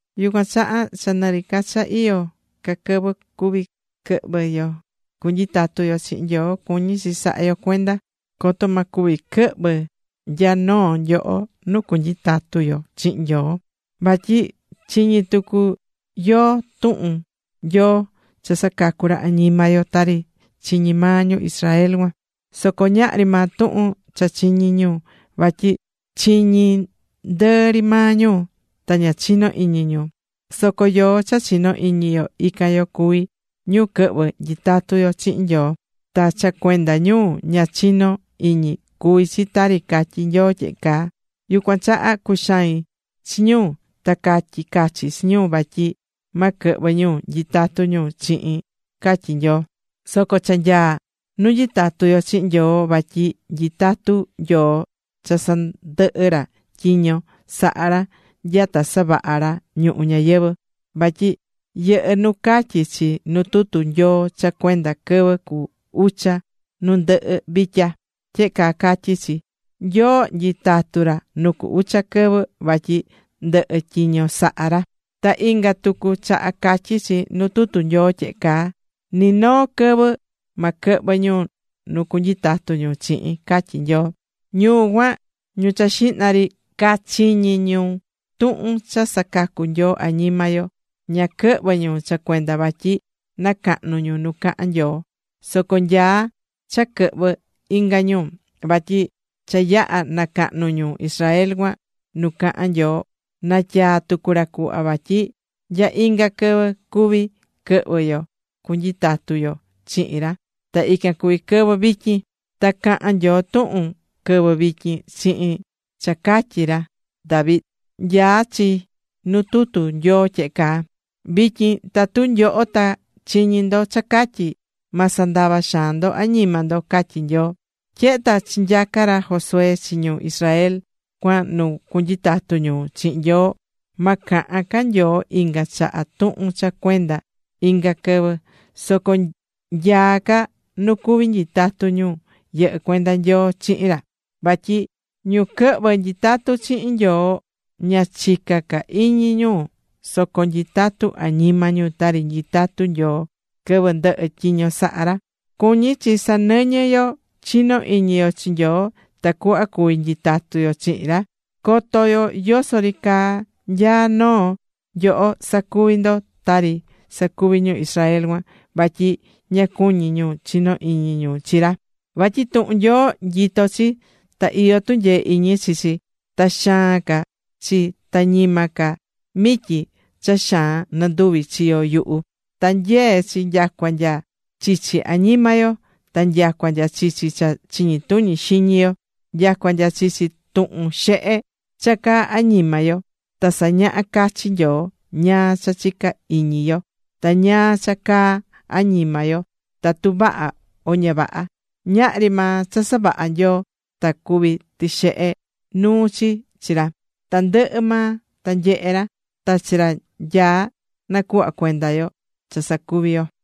Yucuan chaha, cha nɨ ri ca cha iyó ca quɨvɨ cuví quɨhvɨ yo cunyitatu yo chihin Nyoo, cuñí chi saha yo cuenda coto ma cuvi quɨhvɨ nya noo nyoho nu cunyitatu yo chihin Nyoo. Vatyi chiñi̱ tucu yoó tuhun Nyoo cha sacacú ra añima yo, tari chiñi̱ maa ñu Israel cuan. Soco ñahri maa tuhun cha chiñi̱ ñu, vatyi chiñi̱ ndɨɨ ri maa ñu, ta ña chino̱ iñi ñu. Soco yoó cha chinó iñi yo, ican yo cuví ñu quɨhvɨ́ nyitatu chihin Nyoo. Ta cha cuenda ñu ña chinó iñi cuvi̱ chi tari catyí Nyoo tyehe caa: Yucuan chaha cuxai̱n chi ñu ta catyi̱ cachi chi ñu vatyi ma quɨhvɨ ñu nyitatu ñu chihin, catyí Nyoo. Soco cha nyaá nu nyitatú yo chihin Nyoo vatyi nyitatú Nyoo cha sandɨhɨ̱ ra tyiño sahá ra nyata savaha̱ ra ñuhu ñayɨvɨ̱. Vatyi yɨhɨ́ nu catyí chi nu tutu Nyoo cha cuenda quɨvɨ cu ucha nu ndɨhɨ vitya. Tyehe caa catyí chi: Nyoo nyitatu̱ ra nu cu ucha quɨvɨ, vatyi ndɨhɨ̱ tyiño saha̱ ra. Ta inga tucu chaha catyí chi nu tutu Nyoo tyehe caa: Ni noo quɨvɨ ma quɨhvɨ ñu nu cunyitatu ñu chihin, catyí Nyoo. Ñu cuan, ñu cha xihna ri cachiñi̱ tuhun cha sacacú Nyoo añima yo, ña quɨhvɨ̱ ñu cha cuenda vatyi nacahnu̱ ñu nu cahán Nyoo. Soco nyaá cha quɨhvɨ inga ñu. Vatyi cha yaha̱ nacahnu̱ ñu Israel cuan nu caha̱n Nyoo, natyaa̱ tucu ra cuhva vatyi nya inga quɨvɨ cuví quɨhvɨ yo cunyitatu yo chihin ra, ta ican cuví quɨvɨ vityin. Ta cahán Nyoo tuhun quɨvɨ vityin chihin cha catyí ra David. Nyaá chi nu tutu Nyoo tyehe caa: Vityin tatu nyoho ta chiñí ndo cha catyí, Ma sandava xaan ndo añima ndo, catyí Nyoo. Tyehe ta chinyaca̱ ra Josué chi ñu Israel cuan nu cunyitatu ñu chihin Nyoo, ma cahan ca Nyoo inga chaha tuhun cha cuenda inga quɨvɨ. Soco nyaá ca nu cuví nyitatu ñu yɨhɨ́ cuenda Nyoo chihin ra. Vatyi ñu quɨhvɨ́ nyitatu chihin Nyoo, ña chicá ca iñi ñu soco nyitatú añima ñu tari nyitatu̱ Nyoo quɨvɨ ndɨhɨ̱ tyiño saha ra. Cuñí chi sanɨñɨ yo chinó iñi yo chi Nyoo tacuhva cuví nyitatu yo chihin ra, coto yoso ri caa nya noo nyoho sacuvi ndo tari sacuvi̱ ñu Israel cuan vatyi ña cuñí ñu chino iñi ñu chi ra. Vatyi tuhun Nyoo, nyitó chi, ta iyó tunyee iñi chi chi. Ta xaan ca chi ta ñima ca mityi cha xaan nɨnduvi chiyo yuhu, ta nyee chi nyacua nya chichi añima yo ta nyacua nya chichi cha chiñi tuñi xiñi yo, nyacua nya chichi tuhun xehe cha caá añima yo. Ta sañahá cachi Nyoo ñáá cha chicá iñi yo ta ñáá cha caá añima yo tatu vaha o ña vaha. Ñahri maa cha savaha̱ Nyoo ta cuví tixehe nuu chi chi ra. Tandɨhɨ maa ta nyehé ra. Ta chi ra nyaá nacuhva cuenda yo cha sacuví yo.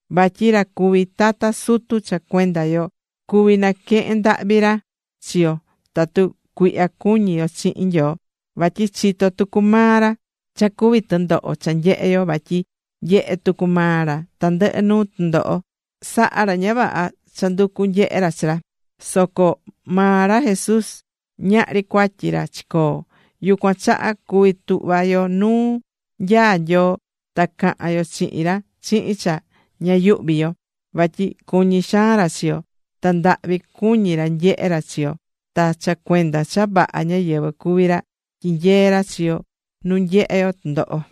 Vatyi ra cuví tata sutu cha cuenda yo cuví naquehen ndahvi ra chi yo tatu cuihya cuñí yo chihin Nyoo, vatyi chitó tucu maa ra cha cuví tɨndoho cha nyehe yo vatyi nyehe̱ tucu maa ra tandɨhɨ nuu tɨndoho, saha̱ ra ña vaha cha nducu̱ nyehe ra chi ra, soco maa ra Jesús, ñahri cuatyi ra chicoo̱. Yucuan chaha cuví tuhva yo nuu nyaá Nyoo ta cahan yo chihin ra chihin cha ña yuhví yo vatyi cuñí xaan ra chi yo, ta ndahvi cuñí ra nyehe ra chi yo. Ta cha cuenda cha vaha ñáyɨvɨ cuví ra, tyinyeé ra chi yo nu nyehe yo tɨndoho.